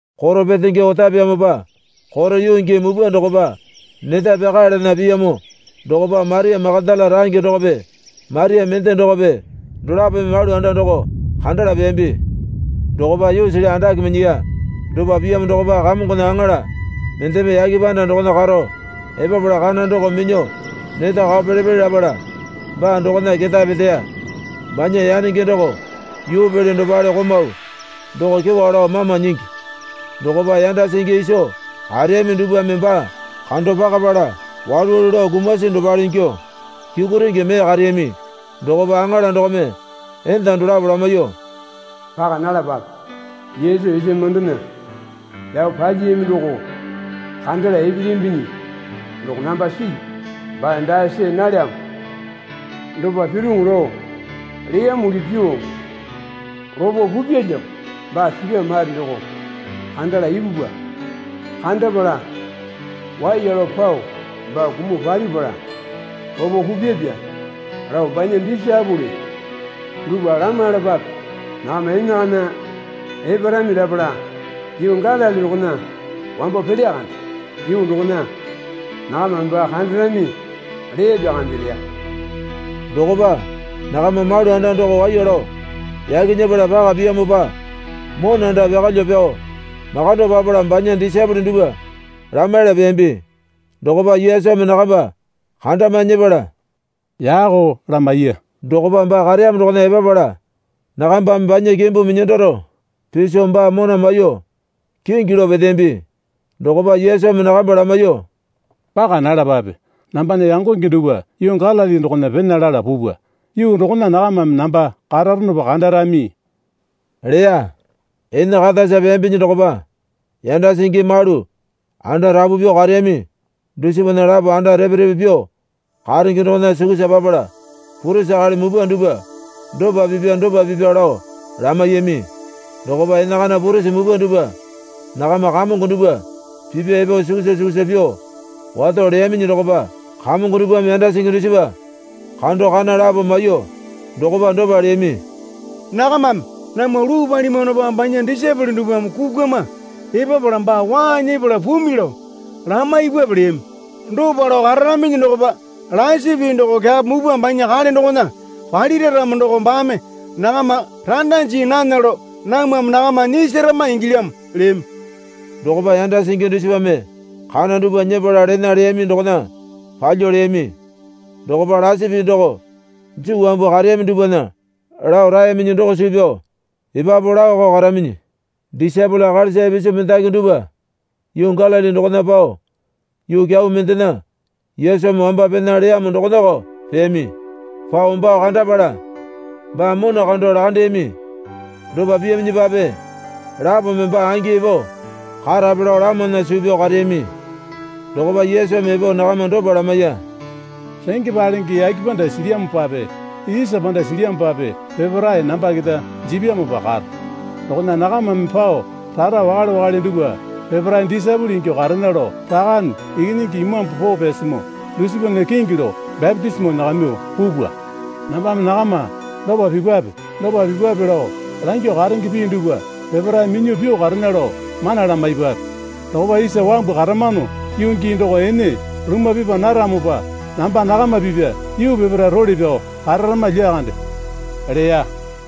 Koro petenge otapeyamopa koro yuu gii mupwa dokopa neta pyakaeyalana piyamo dokopa Maria Makatala range dokope Maria mende dokope dolapome malu anda doko kandala peyambi. Dokopa yuusili andake minyiya. Dopa piyamo dokopa Kamongona aŋala mendeme yake panda dokona karo epapala kana doko minyuo neta kao pele pele lapala baa dokona ketae peteya. Banya yanenge doko yuupele dopale komau doko kyewa lao mama nyingi. Dokopa yanda singi iso kareyami dupwame baa kando pakapala walu walu lao kumasi dopale ingyuo kyukurenge mee kareyami. Dokopa aŋala dokome enda dolapo lamaiyuo, Paka nalapape. Yesu isa mamandona pyao palyiyami doko kandala epelyambinyi doko namba silyu. Baa dae see nalyamo. Dopa piroŋo lao leyamuli pyuo lopo pupyalyamo. Baa sipyamo mare doko kandala ipupwa. Kandapala waiya lao pao, Baa kumuo palipala lopo pupyapya, lao banya disaepole dupwa lamaiyalapape. Nakama enakana eparami lapala yuu Galili dokona wambo pelya kande. Yuu dokona nakamame baa kandarami leyapya kande, leya. Dokopa nakamba malu anda doko waiya lao yaki nyepala paka piyamopa monanda pyakalyuo pyao makando papala banya disaepole dupwa lamaiyala peyambi. Dokopa Yesumi nakamba kandamae nyepala, Yako lamaiya. Dokopa baa kareyamo dokona epapala nakambame banya kimbu minyandaro piso baa mona maiyuo kingi lao peteyambi. Dokopa Yesumi nakamba lamaiyuo, Paka nalapape. Nambana yangonge dupwa yuu Galili dokona pena lala pupwa. Yuu dokona nakamame namba kararonopa kandarami, leya. Ene katasa peyambinyi dokopa yanda singi malu anda rapu pyuo kareyami dusipana lapo anda repe repe pyuo karenge dokona sukusa papala purisi akali mupwa dupwa dopa pipya dopa pipya lao lamaiyami. Dokopa enakana purisi mupwa dupwa nakama kamongo dupwa pipya epo sukusa sukusa pyuo wato leyaminyi dokopa kamongo dupwame yanda singi dusipa kando kana lapo maiyuo dokopa dopa leyami. Nakamame, namwa luu palimwanopa banya disaepole dupwame kukwama epapala baa waa nyepala pumi, lao lamaipwape leyami. Dopa lao kararaminyi dokopa lasi pii doko kyapo mupwa banya kale dokona palira ramo doko baame nakama randa jii nana lao namwame nakama nyisarama ingilyamo, leyami. Dokopa yanda singi dusipame kana dupwa nyepala lena leyami dokona palyuo leyami. Dokopa lasi pii doko Juu wambu kareyami dupwana lao raeyaminyi doko suu pyao epapu laoko karaminyi. Disaepole akalisa ipisu mendaki dupwa yuu Galili dokona pao yuu kyau mendena Yesumi wamba pena leyamo dokonako peyami. Pao baa kandapala baa mona kando lakandeyami. Dopa piyaminyipape lapome, Baa angi epo karape lao lamana suu pyao kareyami. Dokopa Yesumi epo nakama dopa lamaiya. Renge palenge yake panda silyamopape isa panda silyamopape peparae namba keta jipyamopa karo. Dokona nakamame pao rara wakale wakale dupwa peparae disaepole ingyuo karena lao Rakane Ikinyingi Imambu Poo Pyasimoo dusipana kingi lao bapitisimo nyakamyuo pupwa. Nambame nakama dopa pipwape dopa pipwape lao langyuo karenge pii dupwa peparae minyuo pyuo karena lao mana lamaipwape. Dokopa isa wambu karamano yuu gii doko ene lumwa pipa naramopa namba nakama pipya yuu peparae role pyao kararama lyakande, leya.